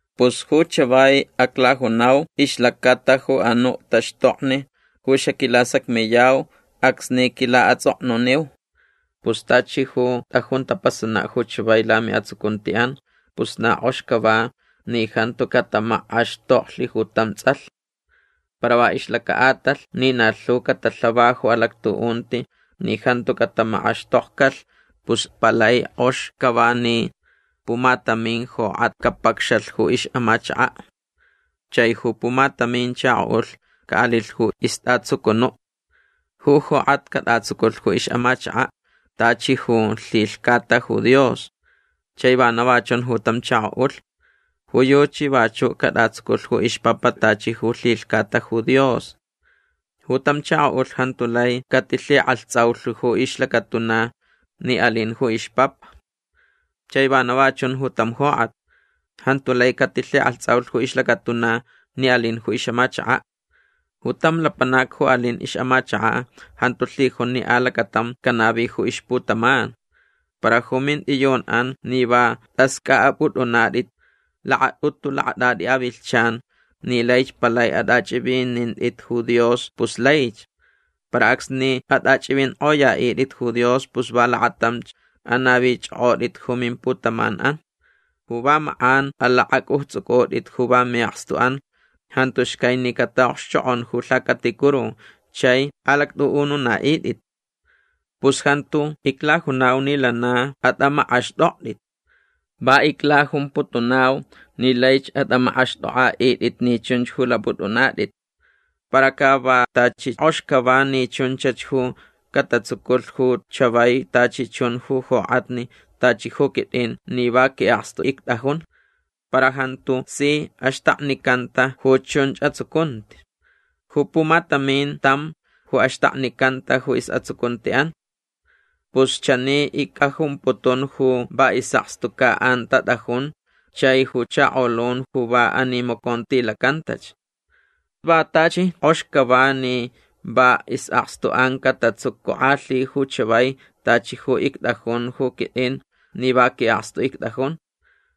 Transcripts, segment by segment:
Pus ju chavai aclajunau ixlacata ju anuʼ taxtokni ju xaquilasacmiyau acsni quilaʼatsʼoknuniu. Pus tachi ju tʼajun tapasanaʼ ju chavai lamiʼatsucuntiʼan pus na kʼox cava ni jantu catamakʼaxtoklh ju tam tsʼalh. Para va ixlacaʼatalh ni na lhu catalhava ju alactuʼunti ni jantu catamakʼaxtokcalh pus palai kʼox cava ni pumatamin jokʼat capacxalh ixʼamachakaʼ. Chai ju pumatamin chakoʼulh caʼalilh ju istʼatsucunuʼ. Ju jokʼat catʼatsuculh ju ixʼamachakaʼ tachi ju lhilhcata ju Dios. Chai vana va chun ju tam chakoʼulh. Ju yuchi vachuʼ catʼatsuculh ju ixpapa tachi ju lhilhcata ju Dios. Ju tam chakoʼulh jantu lai catilhikʼalhtsʼaulh ju ixlacatuna ni alin ju ixpapa. Chai vana va chun ju tam jokʼat. Jantu lai catilhikʼalhtsʼaulh ju ixlacatuna ni alin ju ixʼamachakaʼ. Ju tam lapanac ju alin ixʼamachakaʼ jantu lhijun ni alacatam canavi ju ixputaman. Para ju mintʼiyunʼan ni va tʼascʼaʼapʼutʼunatʼit lakatʼutu lakatʼatʼi avilhchan ni laich palai atʼachʼivinintʼit ju Dios pus laich. Para acsni atʼachʼivinkʼoyaʼitʼit ju Dios pus va lakatamch anavichʼokʼotʼit ju mimputamanʼan. Ju va makʼan alakʼacʼujtsʼucʼutʼit ju va miʼakstuʼan jantu xcai ni cataʼokxchokʼon ju lhacaticuru chai alactʼuʼununaʼitʼit. Pus jantu iclajunau ni lana atʼamakʼaxtʼoktʼit. Va iclajumputunau ni laich atʼamakʼaxtʼokʼaʼitʼit ni chunch ju lapʼutʼunatʼit. Para ca vak tachi kʼox cava ni chunchach ju catatsuculh ju chavai tachi chun ju jokʼatni tachi ju quitʼin ni va quiʼakstu ictʼajun. Para jantu si axtakninicanta ju chunch atsucunti. Ju pumatamin tam ju axtaknicanta ju isʼatsucuntiʼan. Pus chani icʼajumputun ju va isʼakstucaʼan tatʼajun chai ju chakolun ju va animacontilacantach. Vak tachi kʼox cava ni va isʼakstuʼan catatsucukʼalhi ju chavai tachi ju ictʼajun ju quitʼin ni va quiʼakstu ictʼajun.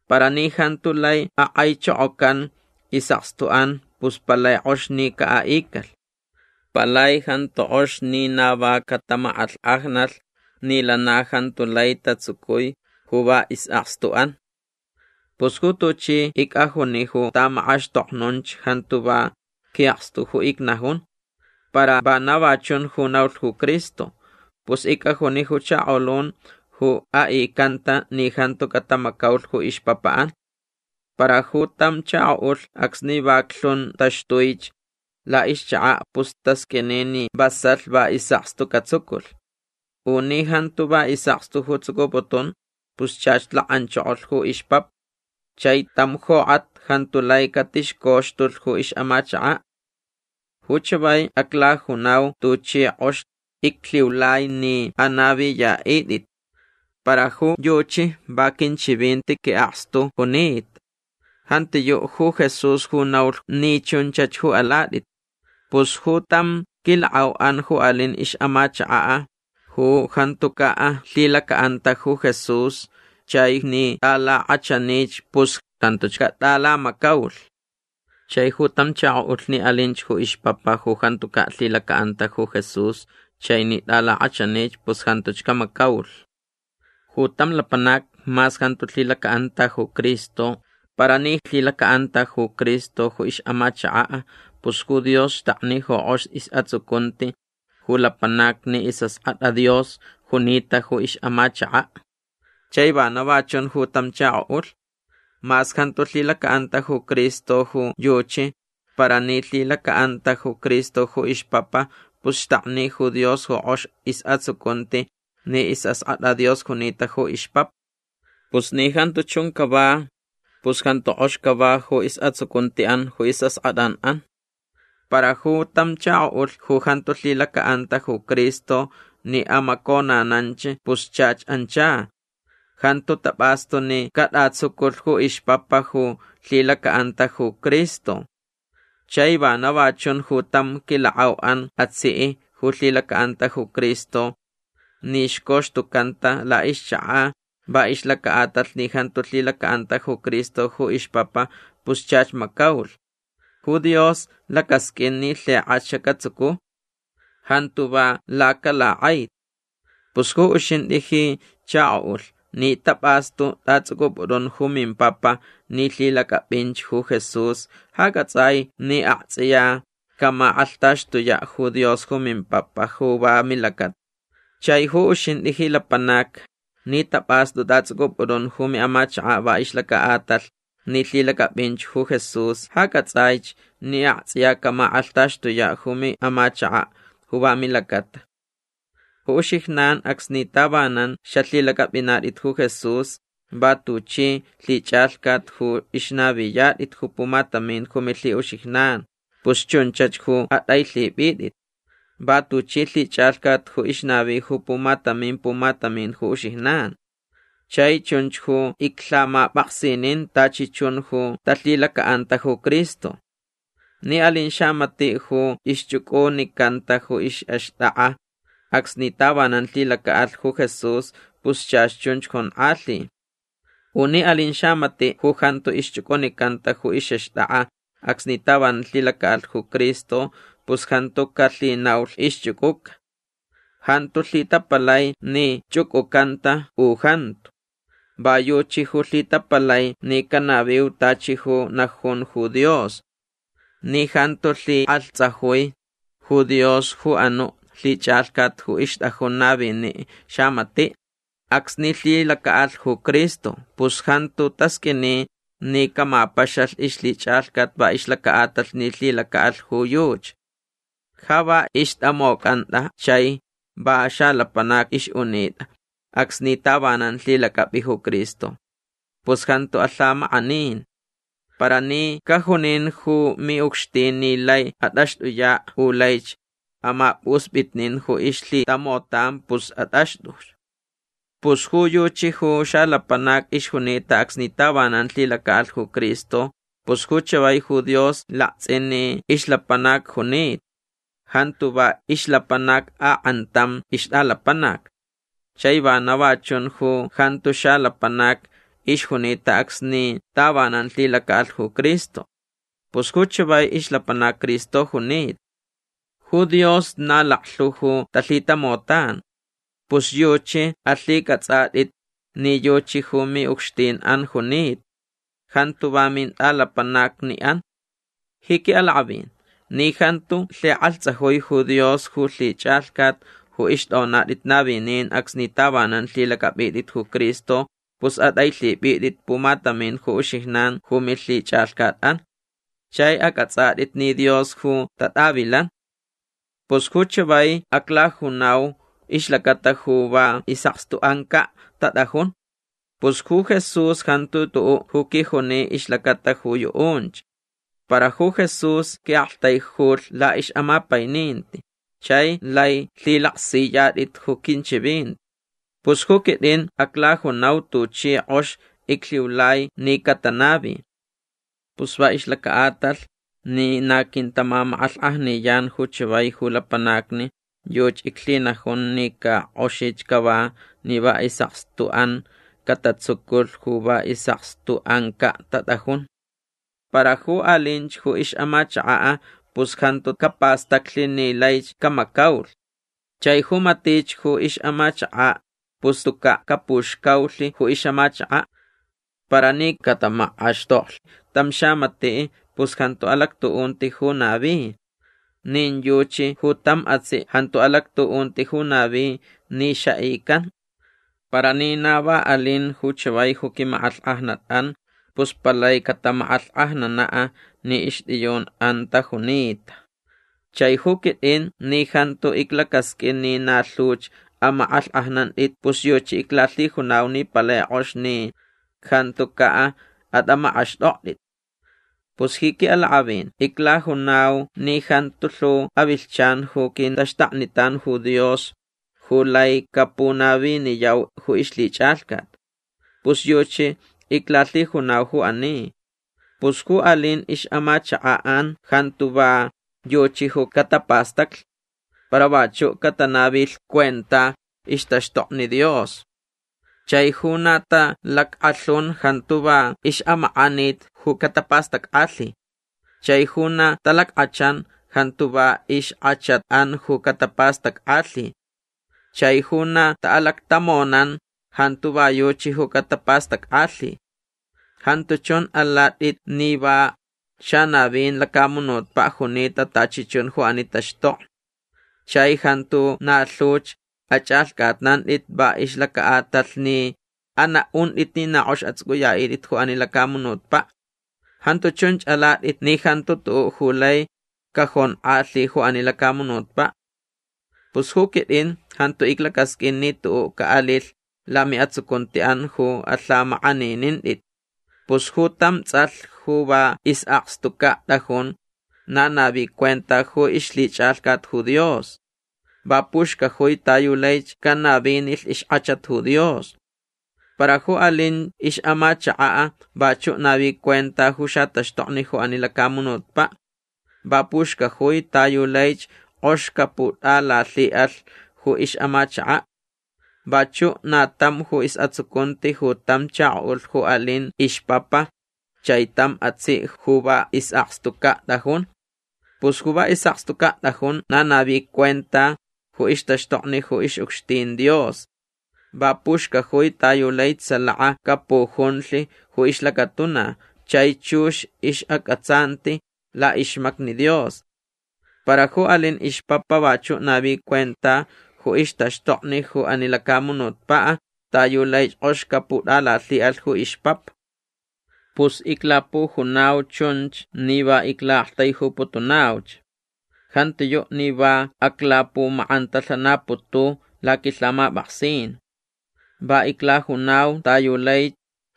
Para ni jantu lai akʼaichokocan isʼakstuʼan pus palai kʼox ni caʼaʼicalh. Palai jantu kʼox ni na va catamakʼalhkʼajnalh ni lana jantu lai tatsucui ju va isʼakstuʼan. Pus ju tuchi icʼajuni ju tamakʼaxtoknunch jantu va quiʼakstu ju icnajun. Para vana va chun ju naulh ju Cristo. Pus icʼajuni ju chakolun ju aʼicanta ni jantu catamacaulh ju ixpapaʼan. Para ju tam chakoʼulh acsni vaclhun taxtuich laʼixchakaʼ pus tasqʼuini ni vasalh va isʼakstu catsuculh. U ni jantu va isʼakstu ju tsucuputun pus chach lakʼanchokolh ju ixpapa. Chai tam jokʼat jantu lai catixcoxtulh ju ixʼamachakaʼ. Ju chavai aclajunau tuchi kʼox iclhiulai ni anaviyaʼitʼit. Para ju yuchi va quinchivinti quiʼakstu junita. Jantiyuʼ ju Jesús ju naulh ni chunchach ju alatʼit. Pus ju tam quilakʼauʼan ju alin ixʼamachakaʼ ju jantucaʼ lhilacaʼanta ju Jesús chai ni tʼalakʼachanich pus jantuch catʼalamacaulh. Chai ju tam chakoʼulh ni alinch ju ixpapa ju jantucaʼ lhilacaʼanta ju Jesús chai ni tʼalakʼachanich pus jantuch camacaulh. Ju tam lapanac mas jantu lhilacaʼanta ju Cristo para ni lhilacaʼanta ju Cristo ju ixʼamachakaʼ pus ju Dios xtakni ju kʼox isʼatsucunti ju lapanac ni isʼaskʼatʼa Dios junita ju ixʼamachakaʼ. Chai vana va chun ju tam chakoʼulh. Mas jantu lhilacaʼanta ju Cristo ju yuchi para ni lhilacaʼanta ju Cristo ju ixpapa pus xtakni ju Dios ju kʼox isʼatsucunti ni isʼaskʼatʼa Dios junita ju ixpapa. Pus ni jantu chun cava pus jantu kʼox cava ju isʼatsucuntiʼan ju isʼaskʼatʼaʼan. Para ju tam chakoʼulh ju jantu lhilacaʼanta ju Cristo ni amaconananch pus chach ancha. Jantu tapʼastu ni catʼatsuculh ju ixpapa ju lhilacaʼanta ju Cristo. Chai vana va chun ju tam quilakʼauʼan atsiʼ ju lhilacaʼanta ju Cristo. Ni xcoxtucanta laʼixchakaʼ va ixlacaʼatalh ni jantu lhilacaʼanta ju Cristo ju ixpapa pus chach macaulh. Ju Dios lacasqʼuin ni lhikʼach catsucu. Jantu va lacalakʼaiti. Pus ju uxintʼi ji chakoʼulh ni tapʼastu tʼatsʼucʼupʼutʼun ju mimpapa ni lhilacʼapʼinch ju Jesús ja cʼatsʼaich ni aktsʼiya camakʼalhtaxtuyaʼ ju Dios ju mimpapa ju va milacata. Chai ju uxintʼi ji lapanac ni tapʼastu tʼatsʼucʼupʼutʼun ju miʼamachakaʼ va ixlacaʼatalh ni lhilacʼapʼinch ju Jesús ja cʼatsʼaich ni aktsʼiya camakʼalhtaxtuyaʼ ju miʼamachakaʼ ju va milacata. Ju uxijnan acsni tavanan xalhilacʼapʼinatʼit ju Jesús va tuchi lhichʼalhcat ju ixnaviyatʼit ju pumatamin ju milhiʼuxijnan pus chunchach ju atʼailhipʼitʼit. Va tuchi lhichʼalhcat ju ixnavi ju pumatamin pumatamin ju uxijnan. Chai chunch ju iclhamapʼaksinin tachi chun ju talhilacaʼanta ju Cristo. Ni alin xamatiʼ ju ixchʼucʼunicanta ju ixʼaxtʼakʼa acsni tavanan lhilacaʼalh ju Jesús pus chach chunch jonkʼalhi. U ni alin xamatiʼ ju jantu ixchʼucʼunicanta ju ixʼaxtʼakʼa acsni tavanan lhilacaʼalh ju Cristo pus jantu calhinaulh ixchʼucʼuca. Jantu lhitapalai ni chʼucʼucanta u jantu. Va yuchi ju lhitapalai ni canaviu tachi ju najun ju Dios. Ni jantu lhikʼalhtsajui ju Dios ju anuʼ lhichʼalhcat ju ixtʼajun naviniʼ xamatiʼ acsni lhilacaʼalh ju Cristo pus jantu tasqʼuini ni camapaxalh ixlhichʼalhcat va ixlacaʼatalh ni lhilacaʼalh ju yuchi. Ja va ixtʼamocʼantʼa chai va xalapanac ixʼunitʼa acsni tavanan lhilacʼapʼi ju Cristo. Pus jantu alhamakʼanin. Para ni cajunin ju miʼucxtin ni lai atʼaxtʼuyaʼ u laich amapʼuspʼitnin ju ixlhitamotan pus atʼaxtʼu. Pus ju yuchi ju xalapanac ixjunita acsni tavanan lhilacaʼalh ju Cristo pus ju chavai ju Dios laktsʼin ni ixlapanac junita. Jantu va ixlapanac akʼantam ixtʼalapanac. Chai vana va chun ju jantu xalapanac ixjunita acsni tavanan lhilacaʼalh ju Cristo. Pus ju chavai ixlapanac Cristo junita. Ju Dios na laklhu ju talhitamotan. Pus yuchi alhicʼatsʼatʼit ni yuchi ju miʼucxtinʼan junita. Jantu va mintʼalapanacniʼan. Ji quiʼalakʼavin ni jantu lhikʼalhtsajui ju Dios ju lhichʼalhcat ju ixtʼonatʼit navinin acsni tavanan lhilacʼapʼitʼit ju Cristo pus atʼailhipʼitʼit pumatamin ju uxijnan ju milhichʼalhcatʼan. Chai acʼatsʼatʼit ni Dios ju tatʼavilan. Pus ju chavai aclajunau ixlacata ju va isʼakstuʼancaʼ tatʼajun. Pus ju Jesús jantu tuʼuʼ ju quijuni ixlacata ju yuʼunch. Para ju Jesús quiʼaktaijulh laʼixʼamapaininti chai lai lhilaksiyatʼit ju quinchivinti. Pus ju quitʼin aclajunau tuchi kʼox iclhiulai ni catanavi. Pus va ixlacaʼatalh ni na quintamamakʼalhkʼajniyan ju chavai ju lapanacni yuchi iclhinajun ni ca kʼoxich cava ni va isʼakstuʼan catatsuculh ju va isʼakstuʼancaʼ tatʼajun. Para ju alinch ju ixʼamachakaʼ pus jantu capastaclh ni laich camacaulh. Chai ju matich ju ixʼamachakaʼ pus tucaʼ capuxcaulh ju ixʼamachakaʼ. Para ni catamakʼaxtoklh tam xamatiʼ pus jantu alactuʼunti ju navi. Nin yuchi ju tam atsiʼ jantu alactuʼunti ju navi ni xaʼican. Para ni na va alin ju chavai ju quimakʼalhkʼajnatʼan pus palai catamakʼalhkʼajnanaʼ ni ixtʼiyunʼan tajunita. Chai ju quitʼin ni jantu iclacasqʼuin ni na lhuch amakʼalhkʼajnantʼit pus yuchi iclalhijunau ni palai kʼox ni jantucaʼ atʼamakʼaxtʼoktʼit. Pus ji quiʼalakʼavin iclajunau ni jantu lhu avilhchan ju quintaxtaknitan ju Dios ju lai capunaviniyau ju ixlhichʼalhcat. Pus yuchi iclalhijunau ju ani. Pus ju alin ixʼamachakaʼan jantu va yuchi ju catapastaclh. Para vachuʼ catanavilh cuenta ixtaxtokni Dios. Chai ju na talackʼalhun jantu va ixʼamakʼanit ju catapastackʼalhi. Chai ju na talackʼachan jantu va ixkʼachatʼan ju catapastackʼalhi. Chai ju na taʼalactamonan jantu va yuchi ju catapastackʼalhi. Jantu chun alatʼit ni va xanavin lacamunutpaʼ junita tachi chun ju ani taxtokni. Chai jantu na lhuch achʼalhcʼatnantʼit va ixlacaʼatalh ni anaʼuntʼit ni na kʼox atsʼucʼuyaʼitʼit ju ani lacamunutpaʼ. Jantu chunch alatʼit ni jantu tuʼuʼ ju lai cajonkʼalhi ju ani lacamunutpaʼ. Pus ju quitʼin jantu iclacasqʼuin ni tuʼuʼ caʼalilh lamiʼatsucuntiʼan ju alhamakʼaninintʼit. Pus ju tam tsʼalh ju va isʼakstucaʼ tʼajun na navi cuenta ju ixlhichʼalhcat ju Dios. Va puxcajui ta yu laich canavinilh ixkʼachat ju Dios. Para ju alin ixʼamachakaʼ vachuʼ navi cuenta ju xataxtokni ju ani lacamunutpaʼ. Va puxcajui ta yu laich kʼox caputʼalalhiʼalh ju ixʼamachakaʼ. Vachuʼ na tam ju isʼatsucunti ju tam chakoʼulh ju alin ixpapa chai tam atsiʼ ju va isʼakstucaʼ tʼajun. Pus ju va isʼakstucaʼ tʼajun na navi cuenta ju ixtaxtokni ju ixʼucxtin Dios. Va puxcajui ta yu laich salaka capujunlh ju ixlacatuna chai chux ixʼacʼatsanti laʼixmacni Dios. Para ju alin ixpapa vachuʼ navi cuenta ju ixtaxtokni ju ani lacamunutpaʼ ta yu laich kʼox caputʼalalhiʼalh ju ixpapa. Pus iclapujunau chunch ni va iclaʼaktaijuputunauch. Jantiyuʼ ni va aclapumakʼantalhanaputu laquilhamapʼaksin. Va iclajunau ta yu lai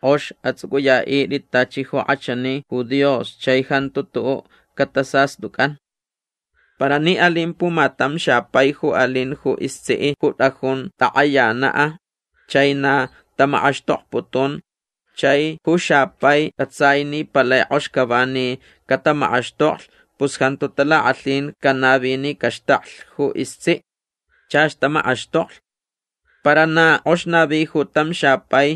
kʼox atsʼucʼuyaʼitʼit tachi ju kʼachani ju Dios chai jantu tuʼuʼ catasastʼucʼan. Para ni alin pumatam xapai ju alin ju istsiʼ ju tʼajun takʼayanaʼ chai na tamakʼaxtokputun chai ju xapai cʼatsai ni palai kʼox cava ni catamakʼaxtoklh pus jantu talakʼalhin canavi ni caxtaklh ju istsiʼ. Chach tamakʼaxtoklh. Para na kʼox navi ju tam xapai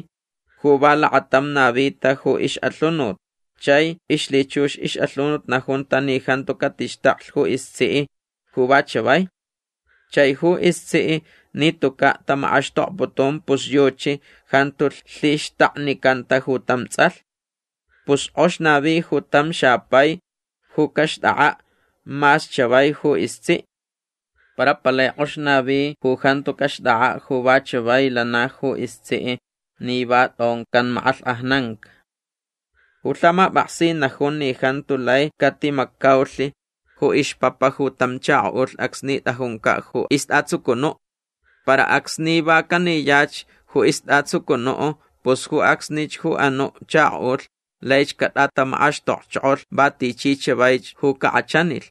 ju va lakatam navita ju ixʼalhunut chai ixlhichux ixʼalhunut najunta ni jantu catixtaklh ju istsiʼ ju va chavai. Chai ju istsiʼ ni tucaʼ tamakʼaxtokputun pus yuchi jantu lhixtaknicanta ju tam tsʼalh. Pus kʼox navi ju tam xapai ju caxtʼakʼaʼ mas chavai ju istsiʼ. Para palai kʼox navi ju jantu caxtʼakʼaʼ ju va chavai lana ju istsiʼ ni va tʼoncan makʼalhkʼajnanca. Ju lhamapʼaksin najun ni jantu lai catimacaulh ju ixpapa ju tam chakoʼulh acsni tʼajuncaʼ ju istʼatsucunuʼ. Para acsni va caniyach ju istʼatsucunuʼ pus ju acsnich ju anuʼ chakoʼulh lai catʼatamakʼaxtokchokolh va tichi chavaich ju cakʼachanilh.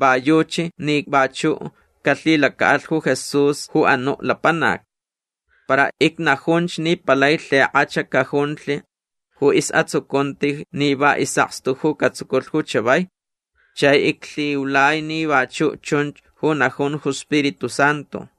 Va yuchi ni vachuʼ calhilacaʼalh ju Jesús ju anuʼ lapanac. Para icnajunch ni palai lhikʼach cajunlh ju isʼatsucunti ni va isʼakstu ju catsuculh ju chavai. Chai iclhiulai ni vachuʼ chun ju najun ju Spiritu Santu.